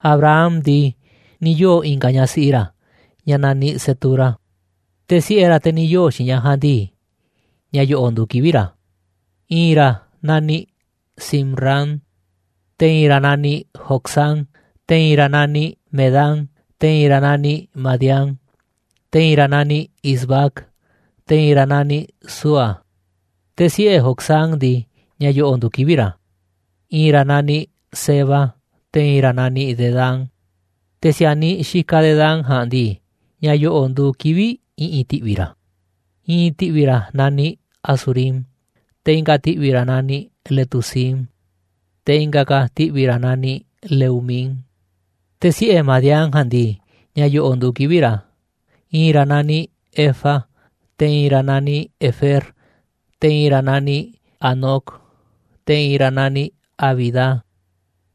Abraham ndii, ni̱ yoo̱ i̱nga̱ ñaꞌ siꞌi ra̱ ñaꞌ naniꞌ Cetura. Te̱ siꞌe̱ ra̱, te̱ ni̱ yoo̱ xiinꞌ ñaꞌ ja̱a̱nꞌ ndii, ña̱ yo̱ꞌo̱ nduuꞌ kivi̱ꞌ ra̱: I̱i̱n ra̱ naniꞌ Zimran, te̱ i̱i̱n ra̱ naniꞌ Jocsán, te̱ i̱i̱n ra̱ naniꞌ Medán, te̱ i̱i̱n ra̱ naniꞌ Madián, te̱ i̱i̱n ra̱ naniꞌ Isbac, te̱ i̱i̱n ra̱ naniꞌ Súa. Te̱ siꞌe̱ Jocsán ndii, ña̱ yo̱ꞌo̱ nduuꞌ kivi̱ꞌ ra̱: I̱i̱n ra̱ naniꞌ Seba, te̱ i̱i̱n ra̱ naniꞌ Dedán. Te̱ si̱a̱niꞌ xikaꞌ Dedán ja̱a̱nꞌ ndii, ña̱ yo̱ꞌo̱ nduuꞌ kivi̱ꞌ i̱ꞌi̱n ti̱ꞌvi̱ ra̱: I̱i̱n ti̱ꞌvi̱ ra̱ naniꞌ Asurím, te̱ i̱nga̱ ti̱ꞌvi̱ ra̱ naniꞌ Letusím, te̱ i̱nga̱ ka̱ ti̱ꞌvi̱ ra̱ naniꞌ Leumím. Te̱ siꞌe̱ Madián ja̱a̱nꞌ ndii, ña̱ yo̱ꞌo̱ nduuꞌ kivi̱ꞌ ra̱: I̱i̱n ra̱ naniꞌ Efa, te̱ i̱i̱n ra̱ naniꞌ Efer, te̱ i̱i̱n ra̱ naniꞌ Hanoc, te̱ i̱i̱n ra̱ naniꞌ Abida,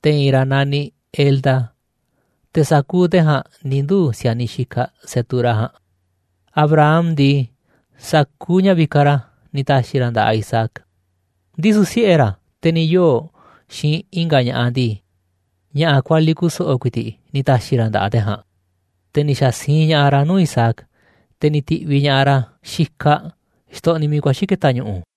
te̱ i̱i̱n ra̱ naniꞌ Elda. Te̱ sa̱kuuꞌ te̱ ja̱a̱nꞌ ni̱ nduu̱ si̱a̱niꞌ xikaꞌ Cetura ja̱a̱nꞌ. Abraham ndii, sa̱kuuꞌ ña̱ vikaꞌ ra̱ ni̱ ta̱xi̱ ra̱ nda̱ꞌaꞌ Isaac. Ndisu̱ siꞌe̱ ra̱, te̱ ni̱ yoo̱ xiinꞌ i̱nga̱ ña̱ꞌaꞌ ndii, ña̱ꞌa̱ kualiꞌ kuso̱ꞌo̱ ku̱i̱ti̱ꞌ ni̱ ta̱xi̱ ra̱ nda̱ꞌaꞌ te̱ ja̱a̱nꞌ, te̱ ni̱ xa̱ siinꞌ ña̱ꞌaꞌ ra̱ nuu̱ꞌ Isaac, te̱ ni̱ ti̱ꞌviꞌ ña̱ꞌaꞌ ra̱ xikaꞌ, xtoꞌniꞌ miiꞌ kuaxi̱ ke̱ta̱ ñu̱ꞌu̱.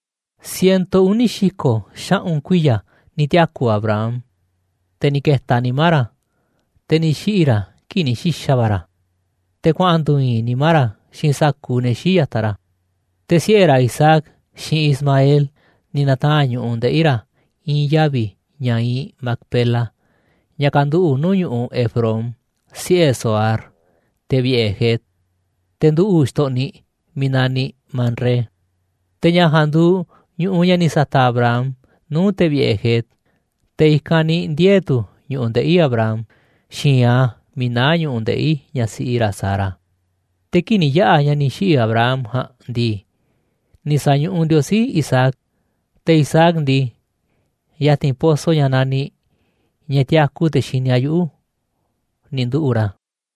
Ciento uni̱ xi̱ko̱ xaꞌu̱n kuiya̱ ni̱ tiaku̱ Abraham, te̱ ni̱ ke̱ta̱ nimá ra̱, te̱ ni̱ xiꞌi̱ ra̱ kii̱ꞌ ni̱ xi̱xa̱ va̱ ra̱, te̱ kuaꞌa̱n ndu̱u̱ i̱i̱n nimá ra̱ xiinꞌ sa̱kuuꞌ ne̱ xii̱ꞌ ya̱taꞌ ra̱. Te̱ siꞌe̱ ra̱ Isaac, xiinꞌ Ismael ni̱ na̱taa̱nꞌ ñu̱ꞌuꞌ ndeꞌi̱ ra̱ i̱i̱n yavi̱, ña̱ iinꞌ Macpela, ña̱ kanduꞌu̱ꞌ nuu̱ꞌ ñu̱ꞌuꞌ Efrón, siꞌe̱ Zohar, te̱ vi̱ꞌe̱ Het, te̱ nduꞌu̱ꞌ xtoꞌniꞌ miiꞌ naniꞌ Manré. Te̱ ña̱ ja̱a̱nꞌ nduuꞌ ñu̱ꞌuꞌ ña̱ ni̱ sa̱ta̱ꞌ Abraham nuu̱ꞌ te̱ vi̱ꞌe̱ Het, te̱ i̱kanꞌ ni̱ ndiee̱ tu̱ ñu̱ꞌuꞌ ndeꞌi̱ Abraham xi̱i̱nꞌ a̱ miiꞌ naá ñu̱ꞌuꞌ ndeꞌi̱ ñaꞌ siꞌi ra̱ Sara. Te̱ kii̱ꞌ ni̱ yaꞌa̱ ña̱ ni̱ xiꞌi̱ Abraham ja̱a̱nꞌ ndii, ni̱ sa̱ñuꞌuꞌ Ndiosí Isaac. Te̱ Isaac ndii, ya̱ti̱n pozo ña̱ naniꞌ «ña̱ tiaku te̱ xini a̱ yuꞌu̱», ni̱ nduꞌu̱ꞌ ra̱.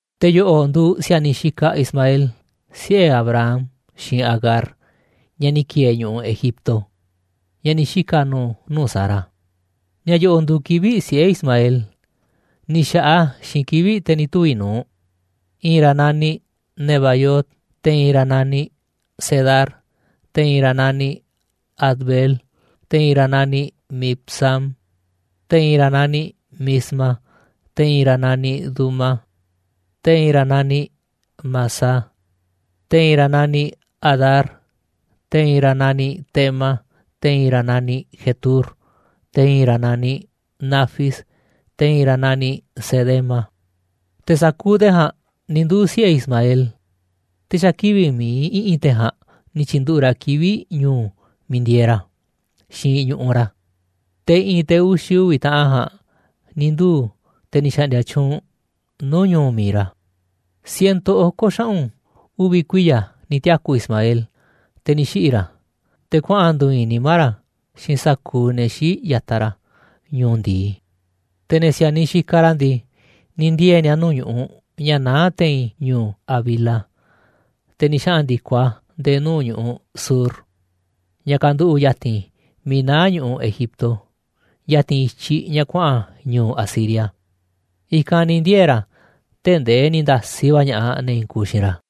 Te̱ yo̱ꞌo̱ nduuꞌ si̱a̱niꞌ xikaꞌ Ismael, siꞌe̱ Abraham xiinꞌ Agar, ñaꞌ ni̱ ki̱e̱e̱ ñu̱ꞌuꞌ Egipto, ñaꞌ ni̱ xika̱ nu̱u̱ nuu̱ꞌ Sara. Ña̱ yo̱ꞌo̱ nduuꞌ kivi̱ꞌ siꞌe̱ Ismael, ni̱ xa̱ꞌaꞌ a̱ xiinꞌ kivi̱ꞌ te̱ ni̱ tuvi̱ nu̱uꞌ: I̱i̱n ra̱ naniꞌ Nebaiot, te̱ i̱i̱n ra̱ naniꞌ Cedar, te̱ i̱i̱n ra̱ naniꞌ Adbeel, te̱ i̱i̱n ra̱ naniꞌ Mibsam, te̱ i̱i̱n ra̱ naniꞌ Misma, te̱ i̱i̱n ra̱ naniꞌ Duma, te̱ i̱i̱n ra̱ naniꞌ Massa, te̱ i̱i̱n ra̱ naniꞌ Hadar, te̱ i̱i̱n ra̱ naniꞌ Tema, te̱ i̱i̱n ra̱ naniꞌ Jetur, te̱ i̱i̱n ra̱ naniꞌ Nafis, te̱ i̱i̱n ra̱ naniꞌ Cedema. Te̱ sa̱kuuꞌ te̱ ja̱a̱nꞌ ni̱ nduu̱ꞌ siꞌe̱ Ismael, te̱ xa̱ kivi̱ꞌ mi̱iꞌ i̱ꞌi̱n te̱ ja̱a̱nꞌ ni̱ tyi̱nduꞌu̱ꞌ ra̱ kivi̱ꞌ ñu̱u̱ miiꞌ ndieeꞌ ra̱, xiinꞌ ñu̱ꞌuꞌ ra̱. Te̱ i̱ꞌi̱n te̱ uxi̱ uvi̱ taꞌan ja̱a̱nꞌ ni̱ nduu̱ꞌ te̱ ni̱ xa̱ꞌndi̱a̱ tyuunꞌ nuu̱ꞌ ñu̱u̱ mi̱iꞌ ra̱. Ciento oko̱ xaꞌu̱n uvi̱ kuiya̱ ni̱ tiaku̱ Ismael, te̱ ni̱ xiꞌi̱ ra̱, te̱ kuaꞌa̱n ndu̱u̱ i̱i̱n nimá ra̱ xiinꞌ sa̱kuuꞌ ne̱ xii̱ꞌ ya̱taꞌ ra̱ ñu̱u̱ ndi̱i. Te̱ ne̱ si̱a̱niꞌ xikaꞌ ra̱ ndii, ni̱ ndiee̱ ni̱a̱ nuu̱ꞌ ñu̱ꞌuꞌ ña̱ naá te̱i̱n ñu̱u̱ Havila te̱ ni̱ xaꞌa̱n ndi̱koꞌ a̱ nde̱e̱ nuu̱ꞌ ñu̱ꞌuꞌ Shur, ña̱ kanduꞌu̱ꞌ ya̱ti̱n miiꞌ naá ñu̱ꞌuꞌ Egipto, ya̱ti̱n i̱tyiꞌ ña̱ kuaꞌa̱n ñu̱u̱ Asiria. I̱kanꞌ ni̱ ndiee̱ ra̱ tee̱ꞌ ndee ni̱ nda̱siꞌ va̱ ña̱ꞌaꞌ ne̱ i̱i̱n kuuꞌ xiinꞌ ra̱.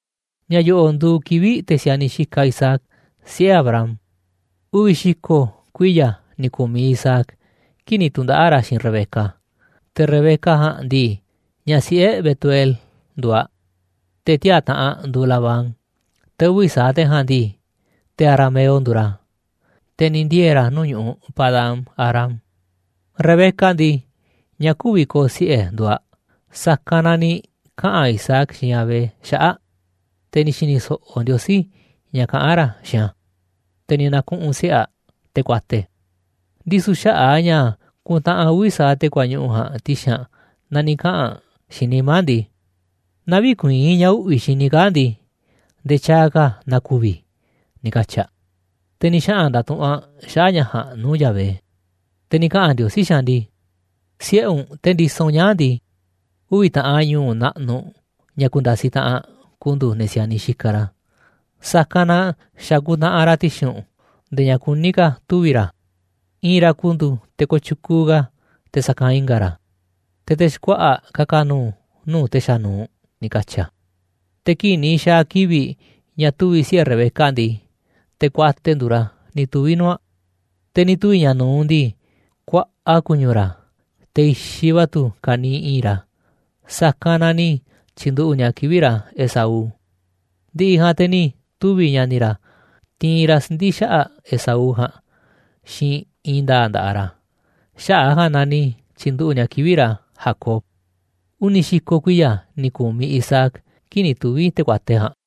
Ña̱ yo̱ꞌo̱ nduuꞌ kivi̱ꞌ te̱ si̱a̱niꞌ xikaꞌ Isaac, siꞌe̱ Abraham. Uvi̱ xi̱ko̱ kuiya̱ ni̱ ku̱miꞌ Isaac kii̱ꞌ ni̱ tu̱ndaꞌa̱ꞌ ra̱ xiinꞌ Rebeca. Te̱ Rebeca ja̱a̱nꞌ ndii, ñaꞌ siꞌe̱ Betuel nduuꞌ aꞌ, te̱ tiaa̱ taꞌanꞌ nduuꞌ Labán, te̱ uvi̱ sa̱aꞌ te̱ ja̱a̱nꞌ ndii, te̱ arameo nduuꞌ ra̱, te̱ ni̱ ndiee̱ ra̱ nuu̱ꞌ ñu̱ꞌuꞌ Padán-arám. Rebeca ndii, ñaꞌ kü̱vi̱ ko̱o̱ siꞌe̱ nduuꞌ aꞌ, sa̱kanꞌ na ni̱ kaꞌa̱n Isaac xiinꞌ Yahvé xaꞌa̱ꞌ aꞌ, te̱ ni̱ xi̱ni̱ so̱ꞌo̱ Ndiosí ña̱ kaꞌán ra̱ xiinꞌ a̱, te̱ ni̱ na̱kuꞌu̱n siꞌe̱ aꞌ, te̱ kuate. Ndisu̱ xaꞌa̱ꞌ a̱ ña̱ ku̱ntaꞌanꞌ uvi̱ sa̱aꞌ te̱ kuañuꞌu̱ ja̱a̱nꞌ ti̱xi̱n aꞌ na ni̱ kaꞌa̱n aꞌ xiinꞌ nimá aꞌ ndii: «Naaꞌ vï̱kuii̱n ña̱ uꞌvi̱ xini i̱ kaa̱ꞌ ndii, nde̱e̱ tyaaꞌ ka̱ na ku̱vi̱ i̱», ni̱ katyi̱ aꞌ. Te̱ ni̱ xaꞌa̱n nda̱tuꞌu̱nꞌ aꞌ xaꞌa̱ꞌ ña̱ ja̱a̱nꞌ nuu̱ꞌ Yahvé. Te̱ ni̱ kaꞌa̱n Ndiosí xiinꞌ aꞌ ndii: ―Siꞌe̱ u̱nꞌ, te̱ ndisoꞌ u̱nꞌ ñaa̱ꞌ ndii, uvi̱ taꞌan ñu̱u̱ naꞌnuꞌ ña̱ ku̱nda̱siꞌ taꞌanꞌ, ku̱ndu̱u̱ ne̱ si̱a̱niꞌ xikaꞌ ra̱, sa̱kanꞌ na xa̱ kuntaꞌanꞌ ra̱ ti̱xi̱n u̱nꞌ nde̱e̱ ña̱ kuní ka̱ tuvi̱ ra̱. I̱i̱n ra̱ ku̱ndu̱u̱ te̱ kooꞌ tyukuuꞌ ka̱ te̱ sa̱kanꞌ i̱nga̱ ra̱, te̱ te̱ xkuaꞌa̱ꞌ ka̱ka̱ nu̱u̱ nuu̱ꞌ te̱ xanuuꞌ ―ni̱ katyi̱ a̱. Te̱ kii̱ꞌ ni̱ xa̱a̱ kivi̱ꞌ ña̱ tuvi̱ siꞌe̱ Rebeca ndii, te̱ kuate nduuꞌ ra̱ ni̱ tuvi̱ nuu̱ꞌ aꞌ. Te̱ ni̱ tuvi̱ ña̱ nu̱uꞌ ndii, kuaꞌa ku̱ñu̱ ra̱, te̱ i̱xiꞌ va̱ tu̱ ka̱niiꞌ i̱i̱nꞌ ra̱. Sa̱kanꞌ na ni̱ tyi̱nduꞌu̱ꞌ ni̱a̱ kivi̱ꞌ ra̱ Esaú. Ndi̱ꞌi̱ ja̱a̱nꞌ te̱ ni̱ tuvi̱ ña̱ni̱ ra̱ tiinꞌ ra̱ siꞌndi̱ xaꞌa̱ꞌ Esaú ja̱a̱nꞌ xiinꞌ i̱i̱n nda̱a̱ꞌ nda̱ꞌaꞌ ra̱, xaꞌa̱ꞌ a̱ ja̱a̱nꞌ na ni̱ tyi̱nduꞌu̱ꞌ ni̱a̱ kivi̱ꞌ ra̱ Jacob. Uni̱ xi̱ko̱ kuiya̱ ni̱ ku̱miꞌ Isaac kii̱ꞌ ni̱ tuvi̱ te̱ kuate ja̱a̱nꞌ.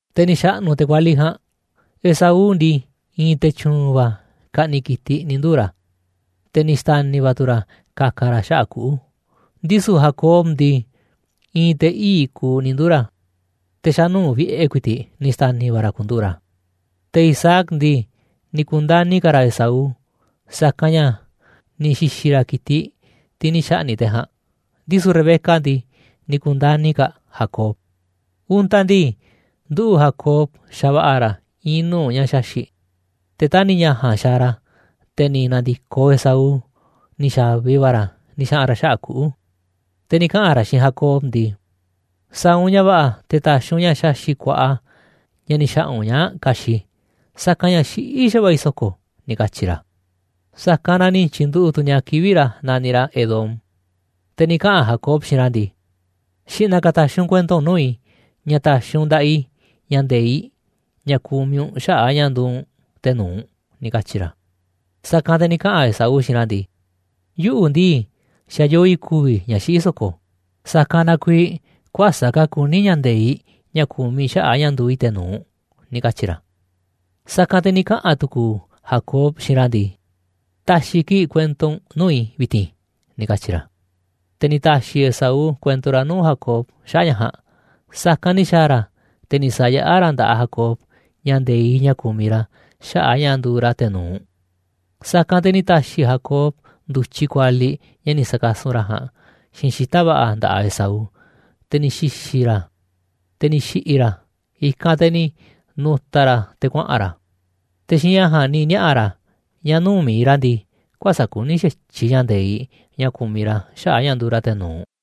Te̱ ni̱ xa̱ꞌnu̱ te̱ kualiꞌ ja̱a̱nꞌ, Esaú ndii, i̱i̱n te̱ tyu̱u̱n va̱ ka̱ꞌni̱ꞌ ki̱tiꞌ ni̱ nduu̱ ra̱, te̱ ni̱ xta̱ni̱ va̱ tu̱ ra̱ ka̱ka̱ ra̱ xaꞌa̱ꞌ kuꞌu̱. Ndisu̱ Jacob ndii, i̱i̱n te̱ ii̱ꞌ kuuꞌ ni̱ nduu̱ ra̱, te̱ xa̱nuu̱ꞌ vi̱ꞌe̱ ku̱i̱ti̱ꞌ ni̱ xta̱ni̱ va̱ ra̱ ku̱nduꞌu̱ꞌ ra̱. Te̱ Isaac ndii, ni̱ ku̱ndani̱ ka̱ ra̱ Esaú, sa̱kanꞌ ña̱ ni̱ xi̱xi̱ ra̱ ki̱tiꞌ, tiꞌ ni̱ xa̱ꞌni̱ꞌ te̱ ja̱a̱nꞌ, ndisu̱ Rebeca ndii, ni̱ ku̱ndani̱ ka̱ aꞌ Jacob. Untaꞌ ndii, nduꞌu̱ꞌ Jacob xava̱ꞌa̱ ra̱ i̱i̱n nuu̱ꞌ ña̱ xaxi̱ꞌ, te̱ tani̱ ña̱ ja̱a̱nꞌ xaaꞌ ra̱ te̱ ni̱ na̱ndi̱koꞌ Esaú, ni̱ xa̱vi va̱ ra̱ ni̱ xaꞌa̱n ra̱ xaꞌa̱ꞌ kuꞌu̱, te̱ ni̱ kaꞌa̱n ra̱ xiinꞌ Jacob ndii: ―Sa̱a̱ u̱nꞌ ña̱ va̱ꞌa̱ te̱ ta̱xi̱ u̱nꞌ ña̱ xaxi̱ꞌ kuaꞌa, ña̱ ni̱ xa̱ꞌa̱ u̱nꞌ ñaa̱ꞌ ka̱xi̱ꞌ i̱, sa̱kanꞌ ña̱ xiꞌí xa̱va̱ꞌa̱ i̱ so̱ko̱ ―ni̱ katyi̱ ra̱. Sa̱kanꞌ na ni̱ tyi̱nduꞌu̱ꞌ tu̱ ni̱a̱ kivi̱ꞌ ra̱ naniꞌ ra̱ Edom. Te̱ ni̱ kaꞌa̱n Jacob xiinꞌ ra̱ ndii: ―Xi̱ꞌna̱ ka̱ ta̱xi̱ u̱nꞌ kuento u̱nꞌ nuu̱ꞌ i̱ ña̱ ta̱xi̱ u̱nꞌ nda̱ꞌaꞌ i̱ ña̱ nde̱iꞌ, ña̱ kumiꞌ u̱nꞌ xaꞌa̱ꞌ a̱ ña̱ nduuꞌ u̱nꞌ te̱ nu̱uꞌ ―ni̱ katyi̱ ra̱. Sa̱kanꞌ te̱ ni̱ kaꞌa̱n Esaú xiinꞌ ra̱ ndii: ―Yuꞌu̱ ndii, xa̱ yoo i̱ ku̱vi̱ i̱ ña̱ xiꞌí so̱ko̱, sa̱kanꞌ na kuiiꞌ kuäsa̱ꞌ ka̱ kuní ña̱ nde̱iꞌ ña̱ kumiꞌ i̱ xaꞌa̱ꞌ a̱ ña̱ nduuꞌ i̱ te̱ nu̱uꞌ ―ni̱ katyi̱ ra̱. Sa̱kanꞌ te̱ ni̱ kaꞌa̱n tu̱ku̱u̱ Jacob xiinꞌ ra̱ ndii: ―Ta̱xi̱ kii̱ꞌ kuento u̱nꞌ nuu̱ꞌ i̱ vi̱ti̱n ―ni̱ katyi̱ ra̱. Te̱ ni̱ ta̱xi̱ Esaú kuento ra̱ nuu̱ꞌ Jacob xaꞌa̱ꞌ ña̱ ja̱a̱nꞌ. Sa̱kanꞌ ni̱ xa̱a̱ ra̱, te̱ ni̱ sa̱yaꞌá ra̱ nda̱ꞌaꞌ Jacob ña̱ nde̱iꞌ ña̱ kumiꞌ ra̱ xaꞌa̱ꞌ a̱ ña̱ nduuꞌ ra̱ te̱ nu̱uꞌ. Sa̱kanꞌ te̱ ni̱ ta̱xi̱ Jacob ndu̱tyiꞌ kualiꞌ ña̱ ni̱ sa̱kasun ra̱ ja̱a̱nꞌ xiinꞌ xita̱ꞌ va̱ꞌa̱ nda̱ꞌaꞌ Esaú, te̱ ni̱ xi̱xi̱ ra̱ a̱, te̱ ni̱ xi̱ꞌi̱ ra̱, i̱kanꞌ te̱ ni̱ nu̱ta̱ ra̱ te̱ kuaꞌa̱n ra̱. Te̱ xiinꞌ ña̱ ja̱a̱nꞌ ni̱ niaꞌa̱ ra̱ ña̱ nuu̱ꞌ mi̱iꞌ ra̱ ndii, kuäsa̱ꞌ kuní xa̱tyiꞌ ña̱ nde̱iꞌ ña̱ kumiꞌ ra̱ xaꞌa̱ꞌ a̱ ña̱ nduuꞌ ra̱ te̱ nu̱uꞌ.